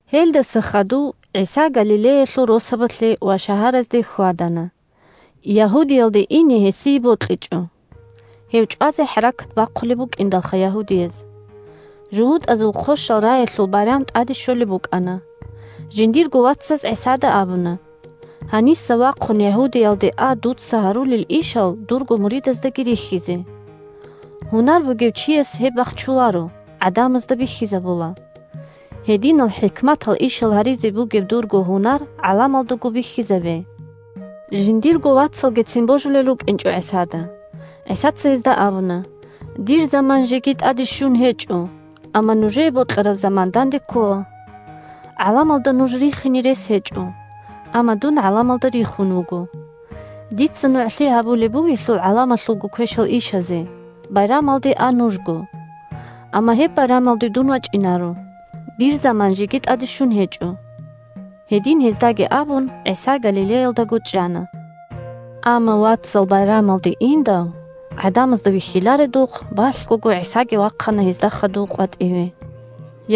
Гьелдаса хадув ГӀиса Галилеялъул росабалъе ва шагьаразде хьвадана. Ягьудиялде ине гьесие бокьичӀо, – гьев чӀвазе хӀаракат бахъулеб букӀиндалха ягьудияз. ЖугьутӀазул Хъощал раялъул байрам тӀаде щолеб букӀана. Жиндирго вацаз ГӀисада абуна: – Гьаниса вахъун Ягьудиялде а дуца гьарулел ишал дурго муридаздаги рихьизе. Гьунар бугев чияс гьеб бахчуларо, гӀадамазда бихьизабула. Гьединал хӀикматал ишал гьаризе бугеб дурго гьунар гӀаламалдаго бихьизабе. (Жиндирго вацалгицин божулел рукӀинчӀо ГӀисада.) ГӀисаца гьезда абуна: – Дир заман жеги тӀаде щун гьечӀо, амма нужее бокьараб заман данде ккола. ГӀаламалда нуж рихине рес гьечӀо, амма дун гӀаламалда рихун вуго. Дица нугӀлъи гьабулеб бугелъул гӀаламалъулго квешал ишазе. Байрамалде а нужго. Амма гьеб байрамалде дун вачӀинаро, дир заман жеги тӀаде щун гьечӀо. Гьедин гьездаги абун, ГӀиса Галилеялдаго чӀана. Амма вацал байрамалде индал, гӀадамазда вихьиларедухъ, балъгого ГӀисаги вахъана гьезда хадув къватӀиве.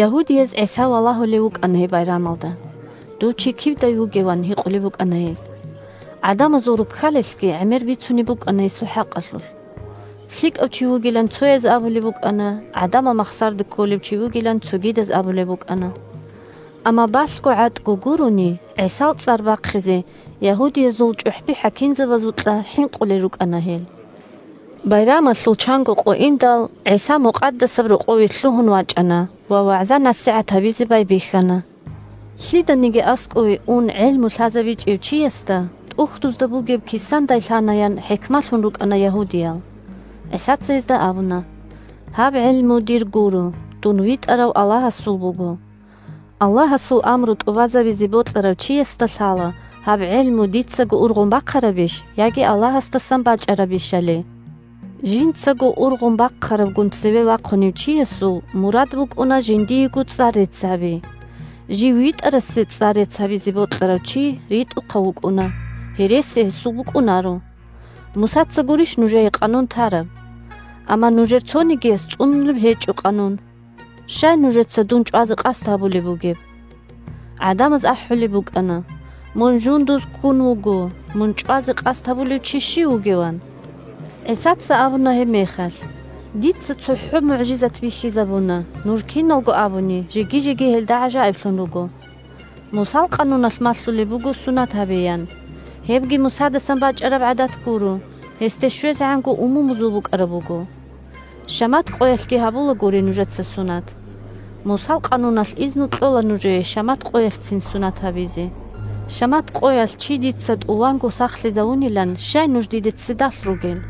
Ягьудияз ГӀиса валагьулев вукӀана гьеб байрамалда. – Дов чи кивдай вугев? – ан гьикъулеб букӀана гьез. ГӀадамазул руккалилъги гӀемер бицунеб букӀана гьесул хӀакъалъулъ. ЛъикӀав чи вугилан цояз абулеб букӀана, гӀадамал махсароде кколев чи вугилан цогидаз абулеб букӀана. Амма балъго-гӀатӀго гурони ГӀисал цӀар бахъизе ягьудиязул чӀухӀби-хӀакимзабазукьа хӀинкъулел рукӀана гьел. Байрамалъул чанго къо индал, ГӀиса Мукъадасаб Рокъове лъугьун вачӀана ва вагӀза-насихӀат гьабизе байбихьана. Лъиданиги аскӀове ун гӀелму лъазабичӀев чиясда ТӀухьдузда бугеб кисандай лъанаян хӀикмалъун рукӀана ягьудиял. ГӀисаца гьезда абуна: – Гьаб гӀелму дир гуро, дун витӀарав Аллагьасул буго. Аллагьасул амру тӀубазабизе бокьарав чиясда лъала гьаб гӀелму дицаго ургъун бахъарабищ яги Аллагьасдасан бачӀарабищали. Жинцаго ургъун бахъарабгун цеве вахъунев чиясул мурад букӀуна жиндиего цӀар-рецц гьаби. Жив витӀарасе цӀар-рецц гьабизе бокьарав чи ритӀухъав вукӀуна, гьереси гьесул букӀунаро. Мусаца гурищ нужее къанун тараб? Амма нужер цонигияс цӀунулеб гьечӀо къанун. Щай нужеца дун чӀвазе къасд гьабулеб бугеб? ГӀадамаз ахӀулеб букӀана: – Мун жундуз ккун вуго. Мун чӀвазе къасд гьабулев чи щив вугев? – ан. ГӀисаца абуна гьебмехалъ: – Дица цохӀо мугӀжизат бихьизабуна, нуж киналго абуни жеги-жеги гьелда гӀажаиблъун руго. Мусал къануналъ малъулеб буго сунат гьабеян. (Гьебги Мусадасан бачӀараб гӀадат гуро, гьесде щвезегӀанго умумузул букӀараб буго.) Шамат къоялъги гьабулагуриха нужеца сунат. Мусал къануналъ изну кьола нужее шамат къоялъцин сунат гьабизе. Шамат къоялъ чи дица тӀуванго сахлъизавунилан щай нуж диде ццидалъ ругел?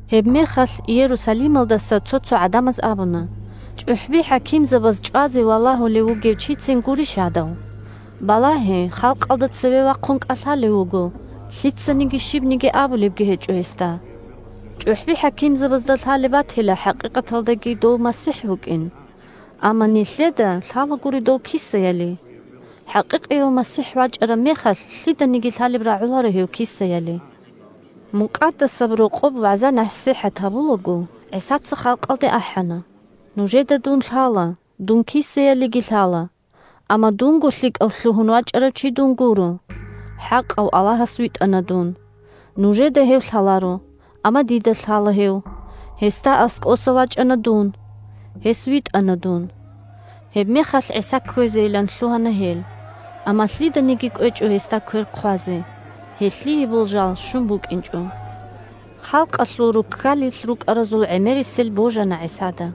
Гьебмехалъ Иерусалималдаса цо-цо гӀадамаз абуна: – ЧӀухӀби-хӀакимзабаз чӀвазе валагьулев вугев чицин гурищ гьадав? Балагье, халкъалда цеве вахъун кӀалъалев вуго, лъицаниги щибниги абулебги гьечӀо гьесда. ЧӀухӀби-хӀакимзабазда лъалеб батила хӀакъикъаталдаги дов МасихӀ вукӀин. Амма нилъеда лъалагури дов кисаяли. ХӀакъикъияв МасихӀ вачӀараб мехалъ, лъиданиги лъалеб рагӀуларо гьев кисаяли. Мукъадасаб Рокъоб вагӀза-насихӀат гьабулаго, ГӀисаца халкъалде ахӀана: – Нужеда дун лъала. Дун кисаялиги лъала. Амма дунго лъикӀав лъугьун вачӀарав чи гуро дун, хӀакъав Аллагьас витӀана дун. Нужеда Гьев лъаларо. Амма дида лъала Гьев: Гьесда аскӀоса вачӀана дун. Гьес витӀана дун. Гьебмехалъ ГӀиса кквезейилан лъугьана гьел, амма лъиданиги кӀвечӀо гьесда квер хъвазе. Гьелъие болжал щун букӀинчӀо. Халкъалъул руккалилъ рукӀаразул гӀемерисел божана ГӀисада.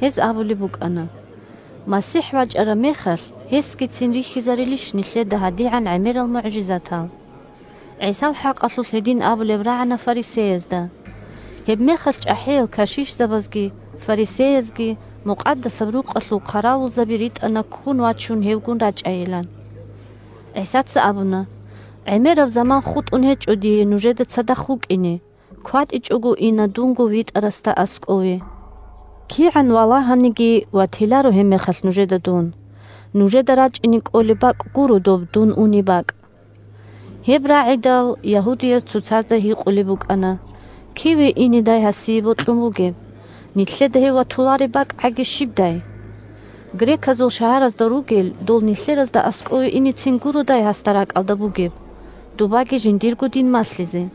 Гьез абулеб букӀана: – МасихӀ вачӀараб мехалъ, гьесгицин рихьизарилищ нилъеда гьадигӀан гӀемерал мугӀжизатал? ГӀисал хӀакъалъулъ гьедин абулеб рагӀана фарисеязда. Гьебмехалъ чӀахӀиял кашишзабазги фарисеязги Мукъадасаб Рукъалъул хъаравулзаби ритӀана ккун вачун гьевгун рачӀайилан. ГӀисаца абуна: – ГӀемераб заман хутӀун гьечӀо дие нужеда цадахъ вукӀине, кватӀичӀого ина дунго витӀарасда аскӀове. КигӀан валагьаниги, ватиларо гьебмехалъ нужеда дун. Нужеда рачӀине кӀолеб бакӀ гуро доб дун унеб бакӀ. Гьеб рагӀидал, ягьудияз цоцазда гьикъулеб букӀана: – Киве инедай гьасие бокьун бугеб? Нилъеда гьев ватулареб бакӀгӀаги щибдай? Греказул шагьаразда ругел дол нилъеразда аскӀове инецин гуродай гьасда ракӀалда бугеб, добаги жиндирго дин малъизе?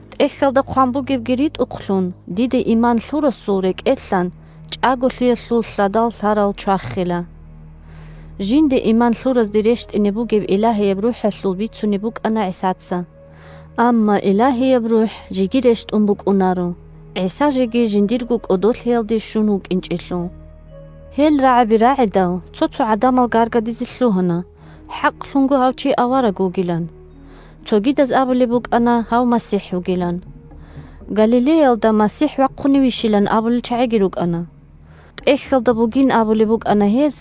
ТӀехьалда хъван бугебги ритӀухълъун, диде иман лъурасул рекӀелъан чӀаголъиялъул лъадал лъарал чвахила. Жинде иман лъуразде рещтӀине бугеб Илагьияб РухӀалъул бицунеб букӀана ГӀисаца. Амма Илагьияб РухӀ жеги рещтӀун букӀунаро, ГӀиса жеги жиндирго кӀодолъиялде щун вукӀинчӀелъул. Гьел рагӀаби рагӀидал, цо-цо гӀадамал гаргадизе лъугьана хӀакълъун гьав чи авараг вугилан. Цогидаз абулеб букӀана гьав МасихӀ вугилан. Галилеялда МасихӀ вахъуневищилан абулел чагӀиги рукӀана. ТӀехьалда бугин абулеб букӀана гьез,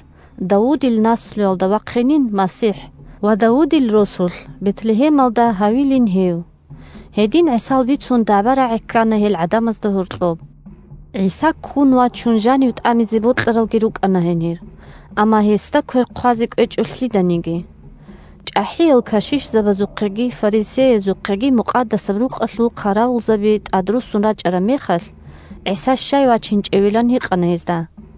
Давудил наслуялда вахъинин МасихӀ ва Давудил росулъ – Бетлегьемалда – гьавилин гьев. Гьедин ГӀисал бицун дагӀба-рагӀи ккана гьел гӀадамазда гьоркьоб. ГӀиса ккун вачун жанив тӀамизе бокьаралги рукӀана гьенир. Амма гьесда квер хъвазе кӀвечӀо лъиданиги. ЧӀахӀиял кашишзабазухъеги фарисеязухъеги Мукъадасаб Рукъалъул хъаравулзаби тӀадруссун рачӀараб мехалъ, ГӀиса щай вачинчӀевилан гьикъана гьезда.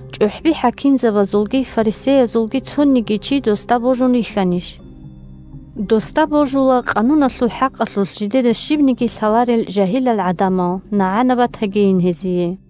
ЧӀухӀби-хӀакимзабазулги фарисеязулги цониги чи досда божун рихьанищ? Досда божула къануналъул хӀакъалъулъ жидеда щибниги лъаларел жагьилал гӀадамал, нагӀана батагийин гьезие!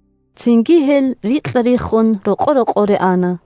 Цинги гьел рикьа-риххун рокъо-рокъоре ана.